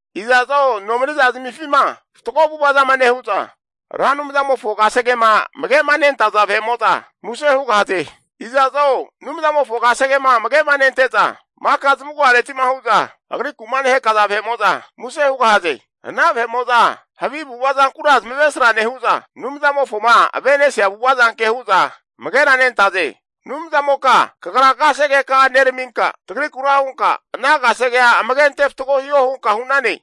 Iza'zo nomani'za zamifima fatgo avu'ava zama nehu'za, Ra Anumzamofo kasegema amage'manentaza vahe'mo'za muse hugahaze. Iza'zo Anumzamofo kasegema amage'ma nente'za vahe'mo'za, maka zamagu'areti'ma hu'za agriku'ma nehakaza vahe'mo'za muse hugahaze. Ana vahe'mo'za havi avu'ava zankura zamavesra nehu'za, Anumzamofoma ave'nesia avu'ava zanke hu'za amageranentaze. Anumzamoka kagra kasegeka'a neraminka tagrikura hunka, ana kasegea amage ante fatgo hiho hunka hu'nane.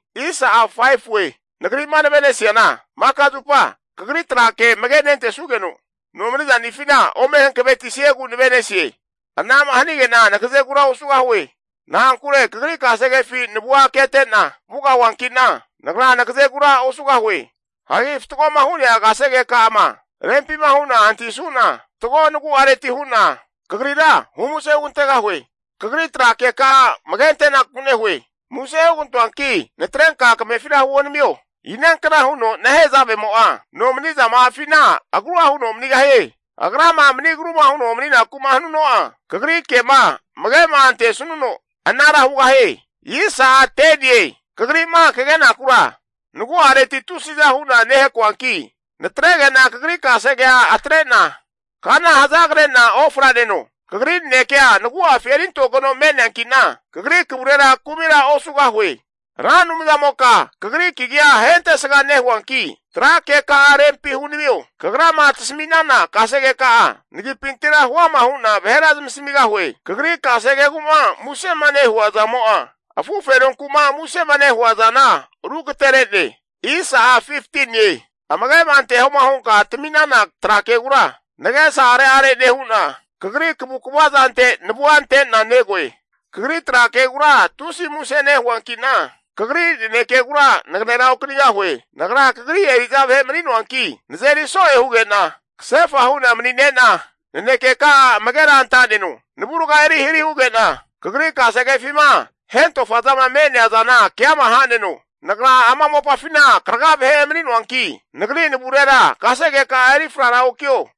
Nagri'ma nave'nesiana maka zupa kagri trake amage nentesugeno, nomani'zanifina ome hankavetisiegu nave'nesie. Ana'ma hanige'na nagazegura osugahue. Na'ankure kagri kasegefi navua ketena vugahiankina, nagra nagazegura osugahue. Hagi fatgoma hu'nea kasegeka'ama rempima hu'na antahisuna, fatgo nagu'areti hu'na kagrira humuse hugantegahue. Kagri tra keka'a amage antenaku nehue. Muse hugantoanki natrenka kamefira huonamio. Inankna huno nehezavemo'a nomani'za ma'afina agrua huno manigahie? Agrama mani agruma huno mani'naku'ma hanuno'a, kagri ke'ma amage'ma antesanuno, anara hugahie. Kagri'ma kagenakura nagu'areti tusiza hu'na nehakoanki, natrege'na kagri kasegea atre'na kana hazagre'na ofraneno. Kagri nanekea nagu'afi erintogeno me'neanki'na, kagri kavurera kumira osugahue. Ra Anumzamoka kagri kagia ahentesga nehuanki, tra keka'a rempi hunamio. Kagrama tasami'nana kasegeka'a, nagipintira huama hu'na vahera zamasamigahue. Kagri kasegegu'ma musema nehua zamo'a, afu fenonku'ma musema nehua zana rugatere'ne. Amage'ma antehoma hunka tami'nana tra kegura nagesa are'are nehu'na, kagri kavukva zante navua ante'na negoe. Kagri tra kegura tusi muse nehuanki'na, kagri nanekegura naganera okanigahue. Nagra kagri eri'za vahe mani'noanki nazeri so'e huge'na, kasefa hu'na manine'na nanekeka'a amagera anta'neno. Navurga eri hari huge'na, kagri kasegefima hentofazama me'nea zana keama ha'neno. Nagra ama mopafina karaga vahe emani'noanki, nagri navurera kasegeka'a eri frara okio.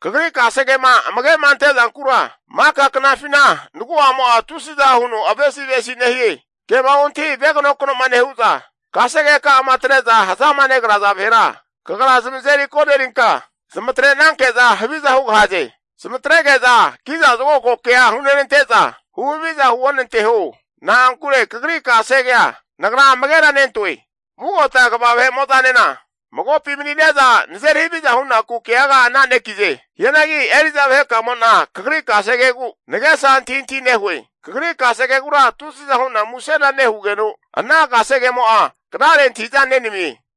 Kagri kasegema amage'ma ante'zankura maka knafina nagu'amo'a tusiza huno avesi'avesi nehie. Kema ontahi veganokno'ma nehu'za kasegeka'ama atre'za hazama negraza vahera, kagra zamazeri konerinka zamatrenanke'za huviza hugahaze. Zamatrege'za kiza zokago kea hunenante'za huhaviza huonanteho. Na'ankure kagri kasegea, nagra amagera nentoe. Vugota kva vahe'mo'zanena magopi manine'za nazeri haviza hunaku keaga ana'nekize. Hianagi eri'za vahekamo'na kagri kasegegu nagesa antahintahi nehue. Kagri kasegegura tusiza hu'na musena nehugeno, ana kasegemo'a knare antahi'za nenamie.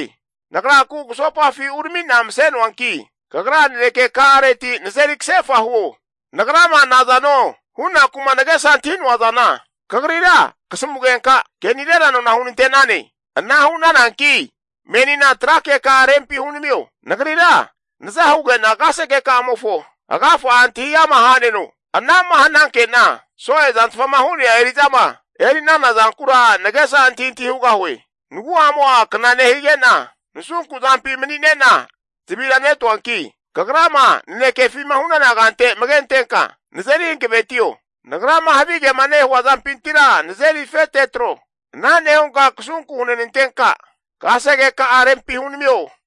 Nagra kugusopafi urami'na mase'noanki, kagra naneke ka'areti nazeri kasefa huo. Nagrama nazano hunaku'ma nagesa antahi'noa zana kagrira kasamugenka, ke'nirera nona hunante'nane. Ana hu'nananki menina tra keka'a rempi hunamio. Nagrira naza huge'na kasegeka'amofo agafa'a antahi ama ha'neno. Ana'ma hananke'na so'e zantfama hu'nea eri'zama eri'nana zankura nagesa antahintahi hugahue. Nagu'amo'a kna nehigena, nasunku zampi mani'nena zavira netoanki, kagrama nanekefima hu'nana kante amage antenka nazeri hankavetio. Nagrama havigema nehua zampintira nazeri afete atro. Ana nehunka kasunku hunantenka, kasegeka'a rempi hunamio.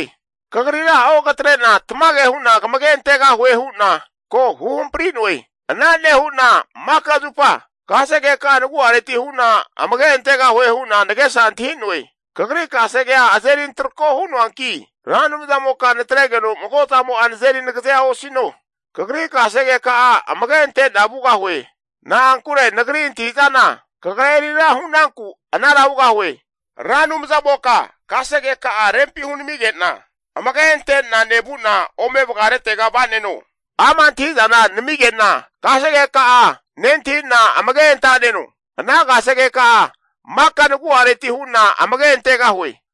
Kagrira ogatre'na tamage hu'na kamage antegahue hu'na ko huhampri'noe. Ana nehu'na maka zupa kasegeka'a, nagu'areti hu'na amage antegahue hu'na nagesa antahi'noe. Kagri kasegea azeri antrako hu'noanki, Ra Anumzamoka natregeno mago zamo'a nazeri nagazea osino. Kagri kasegeka'a, amage ante'na vugahue. Na'ankure nagri antahi'zana, kagra eri ra hu'nanku anara hugahue. Ra Anumzamoka kasegeka'a rempi hunamige'na, amage ante'na nevu'na ome vagaretega va'neno. Ama' antahi'zana namige'na kasegeka'a nentahi'na amage anta'neno. Ana kasegeka'a maka nagu'areti hu'na amage antegahue.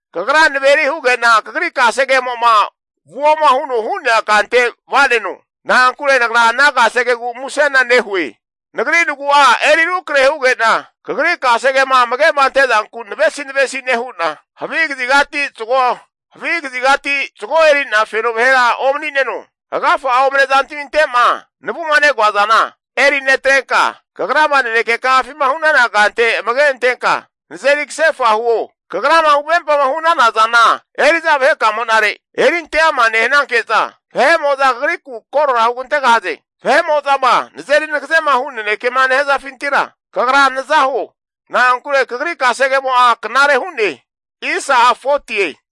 Kagra naveri huge'na kagri kasegemo'ma vuoma huno hu'nea kante vaneno. Na'ankure nagra ana kasegegu musena nehue. Nagri nagu'a eri rukrahe huge'na kagri kasegema amage ante'zanku navesi navesi nehu'na, havi kazigati zago eri'na feno vahera omani'neno. Agafa'a omane zantaminte'ma navuma negoazana eri netrenka, kagrama naneke ka'afima hu'nana kante amage antenka nazeri kasefa huo. Kagrama huvempama hu'nana zana eri'za vahekamo'nare erinteama nehananke'za, vahe'mo'za kagriku korora hugantegahaze. Vahe'mo'zama nazeri nagazema hu nanekema nehazafintira, Kagra naza huo. Na'ankure kagri kasegemo'a knare hu'ne.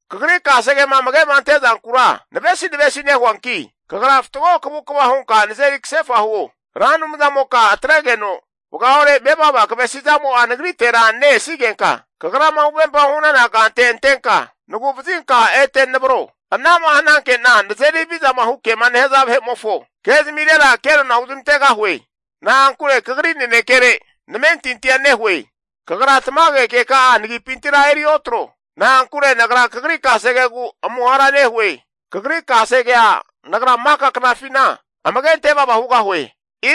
Kagri kasegema amage'ma ante zankura navesi navesi nehuanki, kagra fatgo kavukva hunka nazeri kasefa huo. Ra Anumzamoka atregeno vagaore mevava kavesi zamo'a nagritera ne-esigenka, kagrama huvempama hu'nana kante antenka, nagu'vazinka ete navro. Ana'ma hananke'na nazeri havizama hu kema nehaza vahe'mofo ke'zamirera kenona huzmantegahue. Na'ankure kagri nanekere namentintia nehue. Kagra tamage keka'a nagipintira eri otro. Na'ankure nagra kagri kasegegu amuhara nehue. Kagri kasegea nagra maka knafina amage antevava hugahue.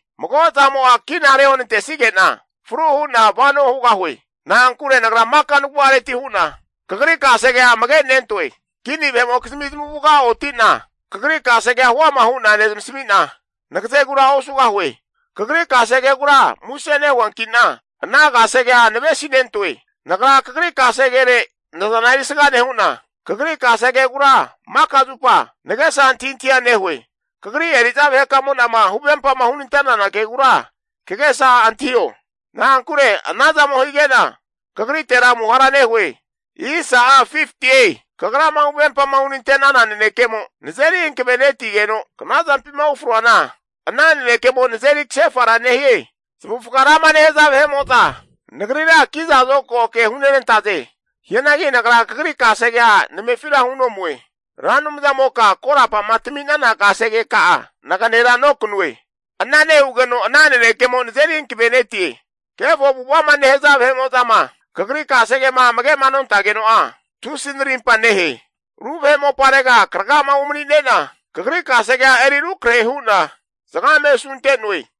Mago zamo'a kina reonantesige'na fru hu'na vano hugahue. Na'ankure nagra maka nagu'areti hu'na, kagri kasegea amage nentoe. Kini vahe'mokizmi zamavuga oti'na kagri kasegea huama hu'na nezamasami'na, nagazegura osugahue. Kagri kasegegura muse nehuankina, ana kasegea navesinentoe. Nagra kagri kasegere nazana erisga nehu'na, kagri kasegegura maka zupa nagesa antahintahia nehue. Kagri eri'za vahekamo'nama huvempama hunante'nana kegura kagesa antahio. Na'ankure anazamo hige'na, kagritera amuhara nehue. Kagrama huvempama hunante'nana nanekemo nazeri hankavenetigeno, knazampima ufroana ana nanekemo nazeri kasefara nehie. Zamavufga rama nehaza vahe'mo'za, nagrira ki'za zokago ke hunenantaze. Hianagi nagra Kagri kasegea namefira hunomue. Ra Anumzamoka korapa'ma tami'nana kasegeka'a naganera nokanue. Ana nehugeno ana nanekemo nazeri hankavenetie. Kefo avu'ava'ma nehaza vahe'mo'zama Kagri kasegema amage'ma nontageno'a, tusi narimpa nehe. Ru vahe moparega kraga'ma umanine'na, Kagri kasegea eri rukrahe hu'na asunte'noe.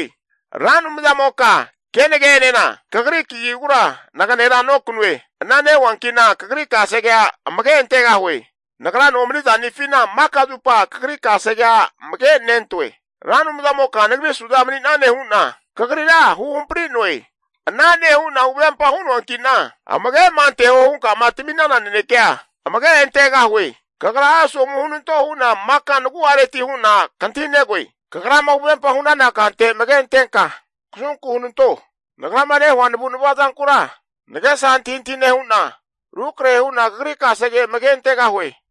Ra Anumzamoka kenage'enena kagri kagigura naganera nokanue. Ana nehuanki'na kagri kasegea amage antegahue. Nagra nomani zanifina maka zupa kagri kasegea amagenentoe. Ra Anumzamoka nagri suza mani'nane hu'na kagrira huhampari'noe. Ana nehu'na huvempa hu'noanki'na amage'ma anteho hunka'ma tami'nana nanekeka'a, amage antegahue. Kagra asomu hunanto hu'na maka nagu'areti hu'na kantahinegoe. Kagrama huvempa hu'nana kante amage antenka, kasunku hunanto. Nagrama nehua navu'nava zankura nagesa antahintahi nehu'na, rukrahe hu'na Kagri kasege amage antegahue.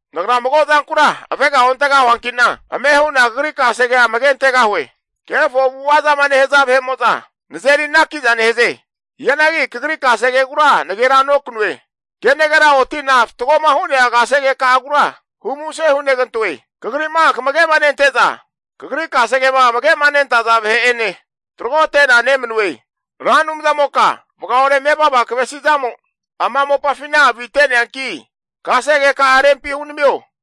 Nagra mago zankura avega ontegahuanki'na, amehu'na Kagri kasegea amage antegahue. Kefo avu'ava zama nehaza vahe'mo'za nazeri anaki'za nehaze. Hianagi Kagri kasegegura nagera nokanue. Kenagera oti'na fatgoma hu'nea kasegeka'agura humuse hunegantoe. Kagri'ma kamagema nente'za vahe'mo'za, Kagri kasegema amage'ma nentaza vahe'ene tragote'na nemanue. Ra Anumzamoka vagaore mevava kavesi'zamo ama mopafina avite'neanki, kasegeka'a rempi hunamio.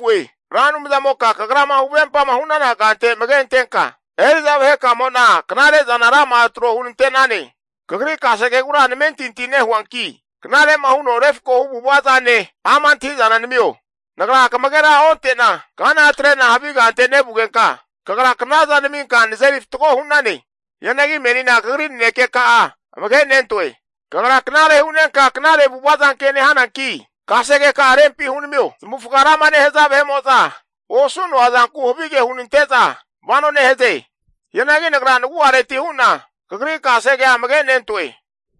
Ra Anumzamoka kagrama huvempama hu'nana kante amage antenka, eri'za vahekamo'na knare'zana rama'a tro hunante'nane. Kagri kasegegura namentinti nehuanki, knare'ma huno refkohu avu'ava zane, ama' antahi'zana namio. Nagra kamagera onte'na kana atre'na havi kante vugenka, kagra knaza naminka nazeri fatgo hu'nane. Hianagi menina kagri nanekeka'a amagenentoe. Kagra knare hu'nenka knare avu'ava zanke nehananki, kasegeka'a rempi hunamio. Zamavufga rama nehaza osu'noa zanku havige hunante'za vano nehaze. Hianagi nagra nagu'areti hu'na, Kagri kasegea amagenentoe.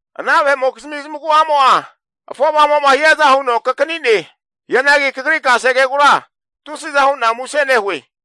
Ana vahe'mokizmi zamagu'amo'a afovamo'ma hiaza huno kakani'ne. Hianagi kagri kasegegura tusiza hu'na muse nehue.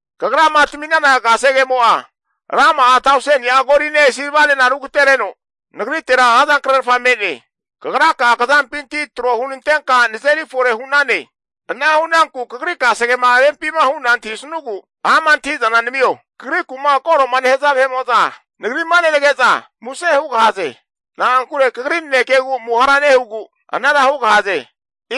Kagrama tami'nana kasegemo'a, rama'a tauseni'a goline silvanena rugatereno nagritera razankrerfa me'ne. Kagraka'a kazampinti tro hunantenka nazeri fore hu'nane. Ana hu'nanku kagri kasegema rempima hu'na antahisanugu ama' antahi'zana namio. Kagriku'ma koro'ma nehaza vahe'mo'za nagri'ma nenage'za muse hugahaze. Na'ankure Kagri nanekegu amuhara nehugu anara hugahaze.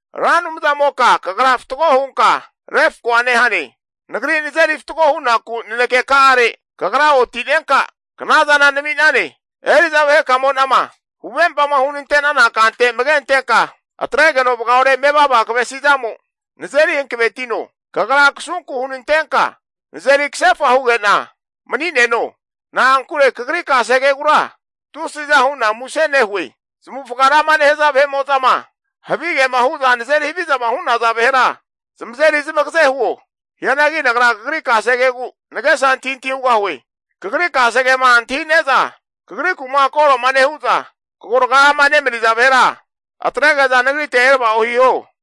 Ra Anumzamoka kagra fatgo hunka refkoa nehane. Nagri nazeri fatgo hunaku naneke ka'are Kagra oti'nenka, knazana nami'nane. Eri'za vahe kamo'nama huvempama hunante'nana kante amage antenka, atregeno vagaore mevava kavesi zamo nazeri hankavetino. Kagra kasunku hunantenka nazeri kasefa huge'na mani'neno. Na'ankure Kagri kasegegura tusiza hu'na muse nehue. Zamavufga rama nehaza vahe'mo'zama havigema hu'za nazeri havizama hu'naza vahera zamazeri zamagaze huo. Hianagi nagra Kagri kasegegu nagesa antahintahi hugahue. Kagri kasegema antahi'neza, kagriku'ma koro'ma nehu'za kagoraga'ama nemaniza vahera atrege'za nagrite erava'o hiho.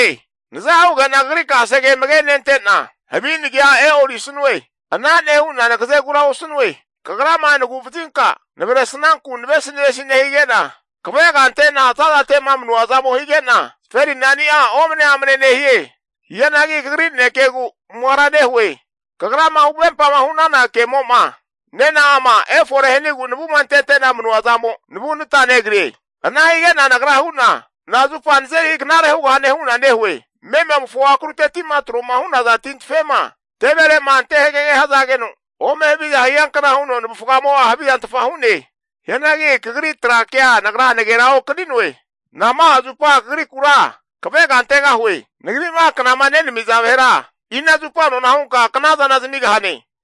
Naza hugena kagri kasege amage nente'na, havi nagia e'orisanue. Ana nehu'na nagazegura osanue. Kagrama nagu'vazinka navresnanku navesinavesi nehige'na kavega ante'na za'zate'ma manua zamo higeno, zaferinani'a omane amane nehie. Hianagi Kagri nanekegu amuhara nehue. Kagrama huvempama hu'nana kemo'ma nena'ama efore hanigu navuma antete'na manua zamo'a, navunata negrie. Ana hige'na nagra hu'na, nazupa nazeri knare hugahane hu'na nehue? Mememofo akrutetima troma hu'naza tintafema teverema ante hagege hazageno, ome haviza hiankna huno navufgamo'a havizantfa hu'ne. Hianagi Kagri tra kea nagra nagera okani'noe. Nama'a zupa Kagrikura kavega antegahue? Nagri'ma knama nenamiza vahera, ina zupa nona hunka knazana zamigahane?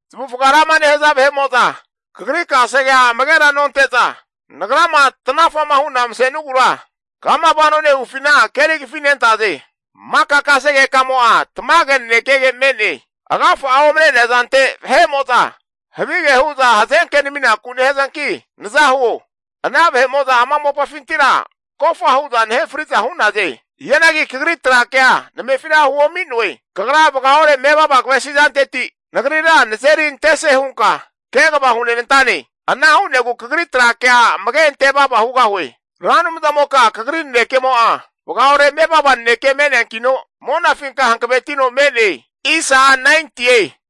Zamavufga rama nehaza vahe'mo'za kagri kasegea amagera nonte'za, nagrama tnafa'ma hu'na mase'nugura kama vano nehufina keri kafinentaze. Maka kasegekamo'a tamage nanekege me'ne. Agafa'a omane'nea zante vahe'mo'za havige hu'za hazenke naminaku nehazanki naza huo. Ana vahe'mo'za ama mopafintira kofahu'za nahe fri'za hu'naze. Hianagi Kagri tra kea namefira huomi'noe. Kagra vagaore mevava kavesi zanteti nagrira nazeri antese hunka kegava hunenantane. Ana hu'negu kagri tra kea amage ante vava hugahue. Ra Anumzamoka Kagri nanekemo'a vagaore mevava naneke me'neankino, monafinka hankavetino me'ne.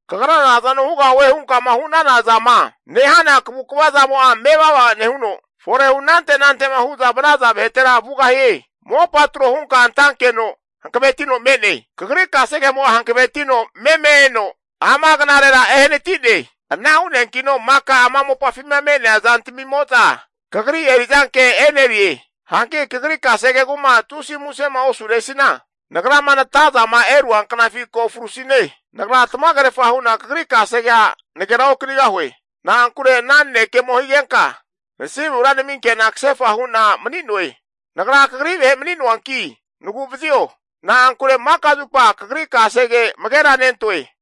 Kagra nazano hugahue hunkama hu'nana zama nehana kavu'ava zamo'a mevava nehuno, forehu anante nante'ma hu'za vanaza vahetera vugahie. Mopa tro hunka antankeno hankavetino me'ne. Kagri kasegemo'a hankavetino meme eno ama knarera ehanati'ne. Ana hu'neankino maka ama mopafima me'nea zantamimo'za Kagri eri'zanke e'nerize. Hanki Kagri kasegegu'ma tusi musema osuresina, nagrama natazama erua knafi ko frusine. Nagra tamagerfa hu'na kagri kasegea nagera okanigahue. Na'ankure ana nanekemo higenka, nasimura naminke'na kasefa hu'na mani'noe. Nagra kagri vahe mani'noanki nagu'vazio. Na'ankure maka zupa Kagri kasege amagera nentoe.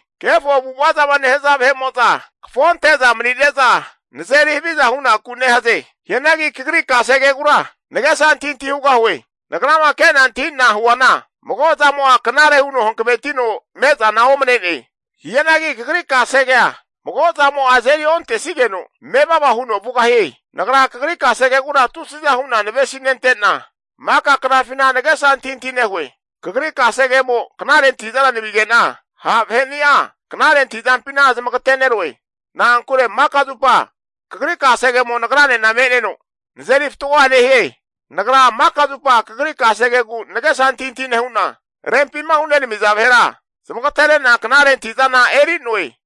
Kefo avu'ava zama nehaza vahe'mo'za kafo ante'za mani'neza nazeri haviza hunaku nehaze. Hianagi Kagri kasegegura nagesa antahintahi hugahue. Nagrama ke'na antahi'na huana, mago zamo'a knare huno hankavetino mezana omane'ne. Hianagi Kagri kasegea mago zamo'a azeri ontesigeno, mevava huno vugahie. Nagra Kagri kasegegura tusiza hu'na navesi nente'na, maka knafina nagesa antahintahi nehue. Kagri kasegemo knare antahi'zana namige'na, ha' vaheni'a knare antahizampina zamagate'neroe. Na'ankure maka zupa Kagri kasegemo nagrane me'neno, nazeri fatgoa nehie. Nagra maka zupa Kagri kasegegu nagesa antahintahi nehu'na, rempima hunenamiza vahera zamagatere'na knare antahi'zana eri'noe.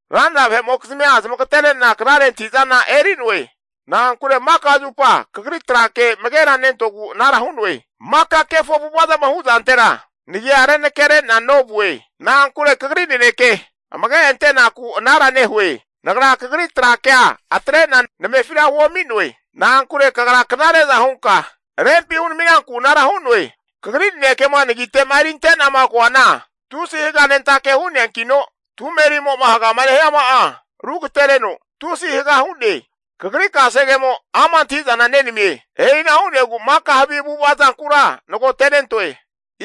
Ranra vahe'mokizmia zamagatere'na knare antahi'zana eri'noe. Na'ankure maka zupa Kagri tra ke amagera nentogu anara hu'noe. Maka kefo avu'ava zama hu'zantera nagia renakere'na novue. Na'ankure kagri naneke amage antenaku anara nehue. Nagra Kagri tra kea atre'na namefira huomi'noe. Na'ankure Kagra knare'za hunka, rempi hunami'nanku anara hu'noe. Kagri nanekema nagite'ma erinte'nama koana, tusi haganentake hu'neankino, tumerimo'ma hagama nehiama'a rugatereno tusi haga hu'ne! Kagri kasegemo ama' antahi'zana nenamie. E'ina hu'negu maka havi avu'ava zankura nagotenentoe.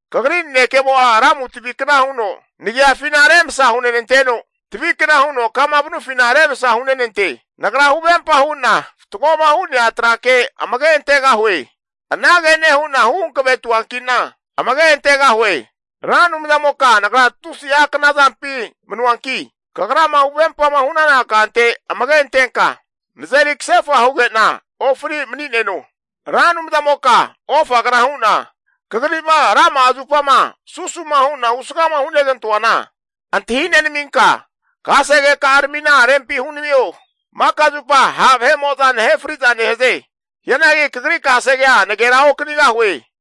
Kagri nanekemo'a lamu tavikna huno nagiafina remasa hunenanteno, tavikna huno kama nevufina remsa hunenante. Nagra huvempa hu'na fatgoma hu'nea trake amage antegahue. Anage nehu'na hu hankavetuanki'na amage antegahue. Ra Anumzamoka nagra tusi'a kna zampi manuanki, Kagrama huvempama hu'nana kante amage antenka, nazeri kasefa huge'na ofri mani'neno. Ra Anumzamoka ofagna hu'na Kagri'ma rama'a zupama susu'ma hu'na husgama hunegantoana antahi nenaminka, kasegeka'aramina rempi hunamio. Maka zupa ha' vahenimo'za nahe fri'za nehaze. Hianagi Kagri kasegea naganera okanigahue.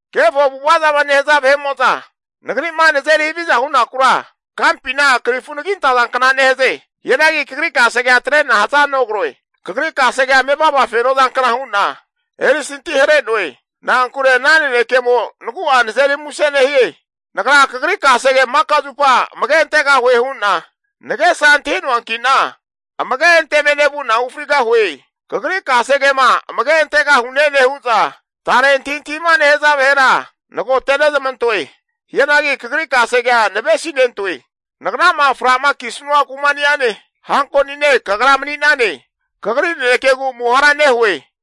Kefo avu'ava zama nehaza vahe'mo'za nagri'ma nazeri haviza hunakura, kampina krifu anagi antazankna nehaze. Hianagi Kagri kasegea atre'na hazanogroe. Kagri kasegea mevava feno zankna hu'na erisanti hare'noe. Na'ankure ana nanekemo, nagu'a nazeri muse nehie. Nagra kagri kasege maka zupa amage antegahue hu'na nagesa antahi'noanki'na, amage anteme nevu'na ufrigahue. Kagri kasegema amage antegahune nehu'za tare antahintahima nehaza vahera nagote'nezmantoe. Hianagi Kagri kasegea navesinentoe. Nagrama fra'ma kisanua kuma'ene hankonine Kagra mani'nane. Kagri nanekegu amuhara nehue.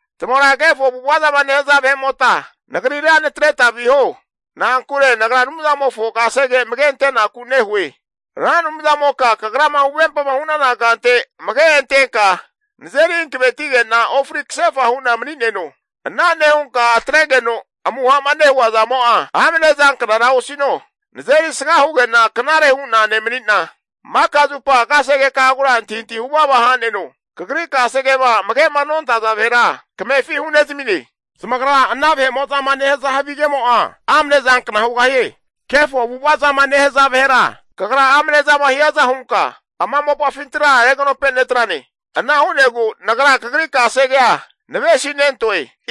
Tamagra kefo avu'ava zama nehaza vahe'mota, nagrira natareta viho. Na'ankure nagra Anumzanimofo kasege amage ante'naku nehue. Ra Anumzamoka kagrama huvempama hu'nana kante amage antenka, nazeri hankavetige'na ofri kasefa hu'na mani'neno. Ana nehunka atregeno amuha'ma nehua zamo'a, amne zanknara osino. Nazeri sga huge'na knare hu'na nemani'na, maka zupa kasegeka'agura antahintahi huvava ha'neno. Kagri kasegema amage'ma nontaza vahera kamefi hunezamine. Zamagra ana vahe'mo'zama nehaza havigemo'a amne zankna hugahie. Kefo avu'ava zama nehaza vahera kagra amne zama hiaza hunka ama mopafintira reganope netrane. Ana hu'negu nagra Kagri kasegea navesinentoe.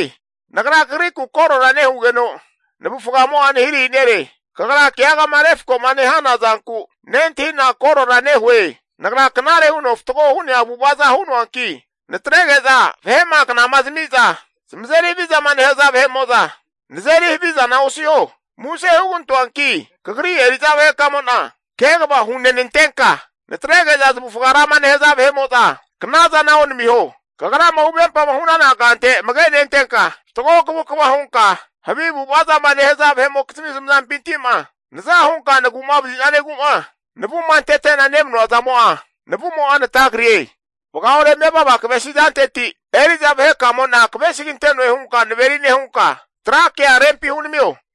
Nagra kagriku koro nehugeno, navufgamo'a nahirahi nere. Kagra keagama refko'ma nehana zanku, nentahi'na korora nehue. Nagra knare huno fatgo hu'nea avu'avaza hu'noanki, natrege'za vahe'ma knama zamiza zamazeri havizama nehaza vahe'mo'za nazeri havizana osiho. Muse hugantoanki kagri eri'za vahekamo'na kegava hunenantenka, natrege'za zmavufga rama nehaza knazana onamiho. Kagrama huvempama hu'nana kante amage nentenka, fatgo kavukva hunka havi avu'ava zama nehaza vahe'mokizmi zamazampinti'ma naza hunka nagu'vazisanegu'ma navuma antete'nama manua zamo'a navumo'a natagrie. Vagaore mevava kavesi zanteti eri'za vahekamo'na kavesigante'noe hunka naveri nehunka, tra keka'a rempi hunamio.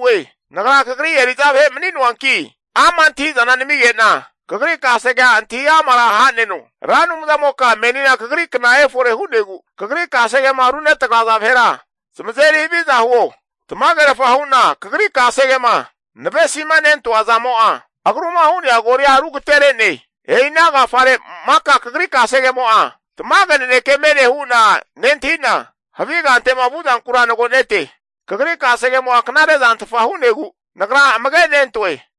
Nagra Kagri eri'za vahe mani'noanki ama' antahi'zana namige'na, Kagri kasegea antahi amara ha'neno. Ra Anumzamoka menina Kagri kna efore hu'negu, Kagri kasegema runetagraza vahera zamazeri haviza huo. Tamagerfa hu'na Kagri kasegema navesimanentoa zamo'a, agruma hu'nea golia rugatere'ne. E'ina agafare maka Kagri kasegemo'a tamage naneke me'ne hu'na nentahi'na, havi kante'ma vu'zankura nagonete. Kagri kasegemo'a knare zantfa hu'negu, nagra amage nentoe.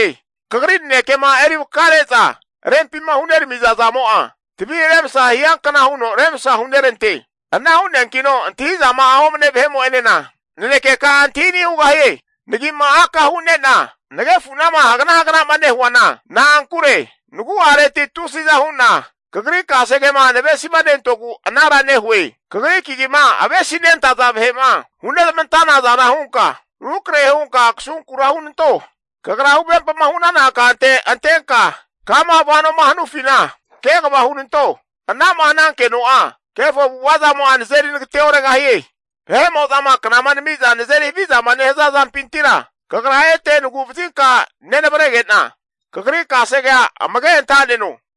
Kagri nanekema eri vakare'za rempima huneramiza zamo'a, tavi remsa hiankna huno remsa hunerante. Ana hu'neankino antahizama'a omane vahe'mo'enena nanekeka'a antahi ani' hugahie. Nagi'ma aka hu'nena nagefunama hagna hagna'ma nehuana, na'ankure nagu'areti tusiza hu'na Kagri kasegema navesinentogu anara nehue. Kagri kagima avesinentaza vahe'ma hunezmantanaza hunka, rukrahe hunka kasunkura hunanto. Kagra huvempama hu'nana kante antenka, kama vanoma hanufina kegava hunanto. Ana'ma hanankeno'a kefo avu'ava zamo'a nazeri nagate oregahie. Vahe'mo'zama knama namiza nazeri havizama nehaza zampintira, Kagra ete navu'vazinka nenavrege'na, Kagri kasegea amage anta'neno.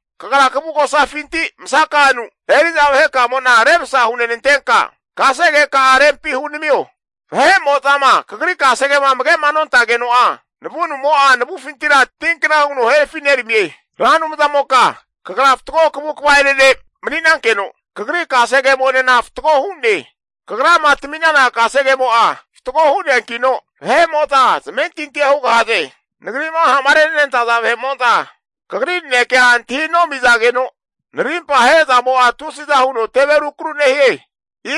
Kagra kavugosafinti masaka'anu eri'za vahekamo'na remsa hunenantenka, kasegeka'a rempi hunamio. Vahemo'zama Kagri kasegema amage'ma nontageno'a, navunumo'a, navufintira tinkna huno herafi neramie. Ra Anumzamoka Kagra fatgo kavukva'ene ne' mani'nankeno, Kagri kasegekamo'enena fatgo hu'ne. Kagrama tami'nana kasegemo'a fatgo hu'neankino, vahe'mo'za zamentintia hugahaze. Nagri'ma ha'ma renenantaza vahe'mo'za Kagri nanekea antahi nomizageno, narimpa ahe'zamo'a tusi'za huno teve rukru nehie.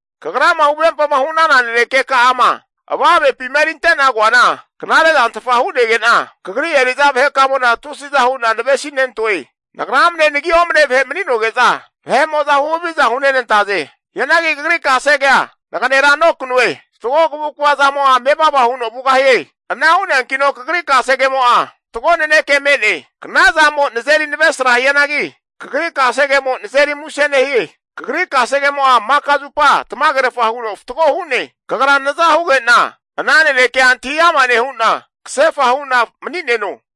Kagrama huvempama hu'nana nanekeka'ama avamepima erinte'na koana knarezantfa hu'nege'na, Kagri eri'za vahekamo'na tusiza hu'na navesinentoe. Nagra amne nagi omane vahe mani'noge'za, vahe'mo'za huhaviza hunenantaze. Hianagi Kagri kasegea naganera nokanue. Fatgo kavukva zamo'a mevava huno vugahie. Ana hu'neankino Kagri kasegemo'a, fatgo naneke me'ne. Knazamo'a nazeri navesra hianagi, kagri kasegemo nazeri muse nehie. Kagri kasegemo'a maka zupa tamagerfa huno fatgo hu'ne. Kagra naza huge'na ana nanekea antahi ama nehu'na, kasefa hu'na mani'neno.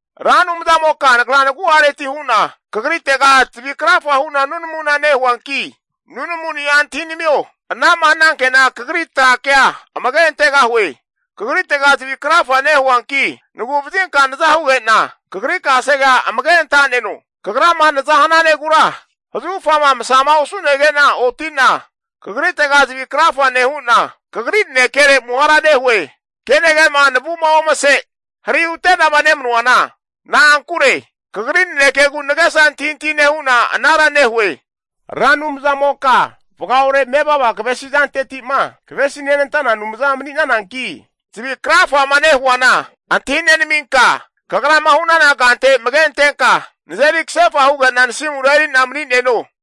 Ra Anumzamoka nagra nagu'areti hu'na Kagritega zavi krafa hu'na nunamuna nehuanki, nunamuni'a antahinamio. Ana'ma hananke'na kagri tra kea amage antegahue. Kagritega zavi krafa nehuanki, nagu'vazinka naza huge'na, Kagri kasegea amage anta'neno. Kagrama naza hananegura zahufama masama osu'nege'na oti'na Kagritega zavi krafa nehu'na, Kagri nanekere amuhara nehue. Kenage'ma navu'ma omase hari hute'nama nemanuana, na'ankure Kagri nanekegu nagesa antahintahi nehu'na anara nehue. Ra Anumzamoka vagaore mevava kavesi zanteti'ma kavesi nenantana Anumza mani'nananki, zavi krafama nehuana antahi nenaminka, Kagrama hu'nana kante amage antenka nazeri kasefa huge'na nasimura eri'na mani'neno.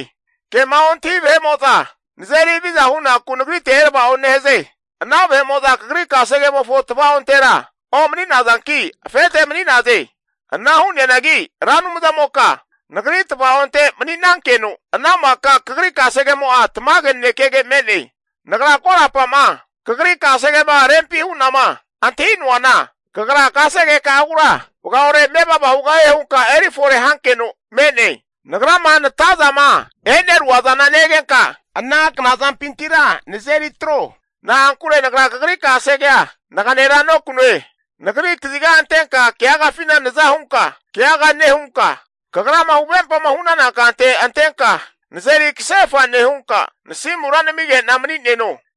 Kema ontahi vahe'mo'za nazeri haviza hunaku nagritega erava'o nehaze. Ana vahe'mo'za Kagri kasegemofo tava'ontera omani'nazanki afete mani'naze. Ana hu'neanagi Ra Anumzamoka nagri tvaonte mani'nankeno, ana maka Kagri kasegemo'a tamage nanekege me'ne. Nagra korapa'ma Kagri kasegema rempi hu'nama antahi'noana, Kagra kasegeka'agura vagaore mevava hugahie hunka eri fore hankeno me'ne. Nagrama natazama e'nerua zana negenka, ana knazampintira nazeri atro. Na'ankure nagra Kagri kasegea naganera nokanue. Nagri kaziga antenka keagafina naza hunka keaga nehunka, Kagrama huvempama hu'nana kante antenka nazeri kasefa nehunka, nasimura namige'na mani'neno.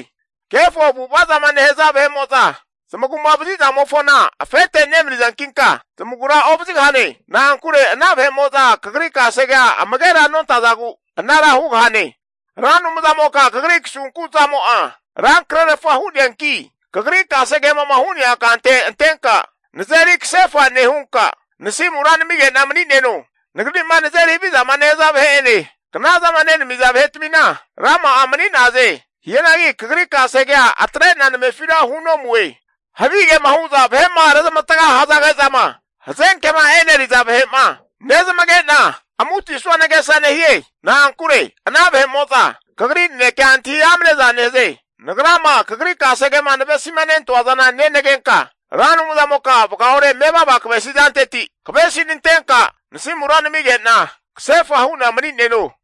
Kefo avu'ava zama nehaza vahe'mo'za zamagu'ma vazizamofona afete nemanizankinka zamagura ovazigahane. Na'ankure ana vahe'mo'za kagri kasegea amagera nontazagu, anara hugahane. Ra Anumzamoka Kagri kasunku zamo'a rankrerfa hu'neanki, kagri kasegemo'ma hu'nea kante antenka nazeri kasefa nehunka, nasimura namige'na mani'neno. Nagri'ma nazeri havizama nehaza vahe'ene knazama nenamiza vahetmina rama'a mani'naze. Hianagi Kagri kasegea atre'na namefira hunomue. Havigema hu'za vahe'ma rezmavatga hazage'zama hazenkema eneriza vahe'ma nezamage'na, amutisanua nagesa nehie. Na'ankure ana vahe'mo'za Kagri nanekea antahi amneza nehaze. Nagrama kagri kasegema navesimanentoa zana nenagenka, Ra Anumzamoka vagaore mevava kavesi zanteti kavesinantenka nasimura namige'na kasefa hu'na mani'neno.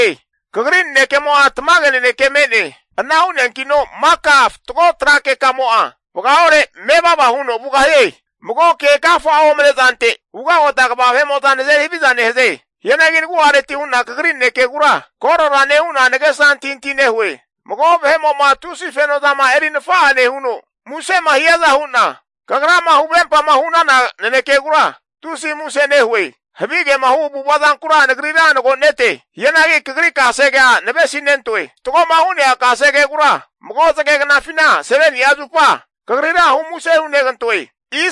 Kagri nanekemo'a tamage naneke me'ne. Ana hu'neankino maka fatgo tra kekamo'a vagaore mevava huno vugahie. Mago ke agafa'a omane zante ugagota kva vahe'mo'za nazeri haviza nehaze. Hianagi nagu'areti hu'na kagri nanekegura korora nehu'na nagesa antahintahi nehue. Mago vahe'mo'ma tusi fenozama eri nafa'a nehuno musema hiaza hu'na, Kagrama huvempama hu'nana nanekegura tusi muse nehue. Havigema hu avu'ava zankura, nagrira nagonete. Hianagi Kagri kasegea navesi nentoe. Fatgoma hu'nea kasegegura, mago zage knafina 7ni'a zupa Kagrira humuse hunegantoe.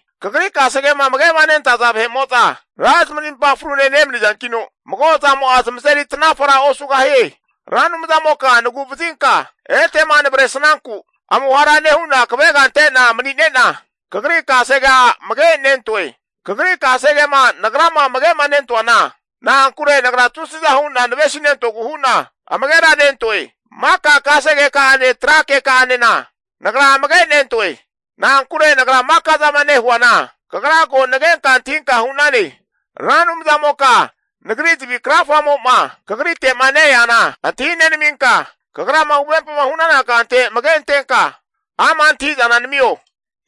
Kagri kasegema amage'ma nentaza vahe'mo'za ra zamarimpa frune nemanizankino, mago zamo'a zamazeri tanafara osugahie. Ra Anumzamoka nagu'vazinka etema navresnanku amuhara nehu'na kavega ante'na manine'na, Kagri kasegea amagenentoe. Kagri kasegema nagrama amage'nentoana, na'ankure nagra tusiza hu'na navesinentogu hu'na amageranentoe. Maka kasegeka'ane tra keka'anena nagra amagenentoe. Na'ankure nagra maka'zama nehuana, Kagra ko nagenka antahinka hu'nane. Ra Anumzamoka nagri zavi krafamo'ma Kagrite'ma ne-eana antahi nenaminka, Kagrama huvempama hu'nana kante amage antenka ama' antahi'zana namio.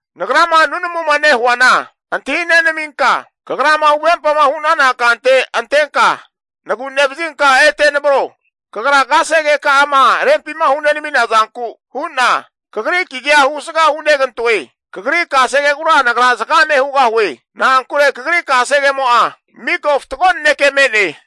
Nagrama nunamuma nehuana antahi nenaminka, kagrama huvempama hu'nana kante antenka nagu nevazinka ete navro. Kagra kasegeka'ama rempima hunenamina zanku hu'na, Kagri kagia husga hunegantoe. Kagri kasegegura nagra zagame hugahue. Na'ankure Kagri kasegemo'a, miko fatgo nanekege me'ne.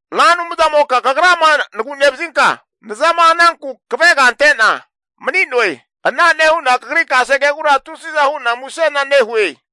Ra Anumzamoka Kagrama nagu'nevazinka nazama hananku kavega ante'na mani'noe. Ana nehu'na Kagri kasegegura tusiza hu'na musena nehue.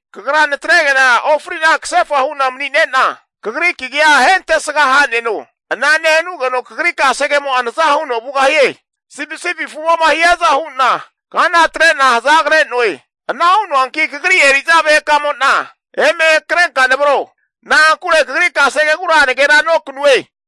Kagra natrege'na ofrina kasefa hu'na manine'na, Kagri kagia ahentesga haneno. Ana nehanugeno Kagri kasegemo naza huno vugahie. Sipisipi afumo'ma hiaza hu'na kana atre'na hazagre'noe. Ana hu'noanki Kagri eri'za vahekamo'na eme hakrenka navro. Na'ankure Kagri kasegegura naganera nokanue.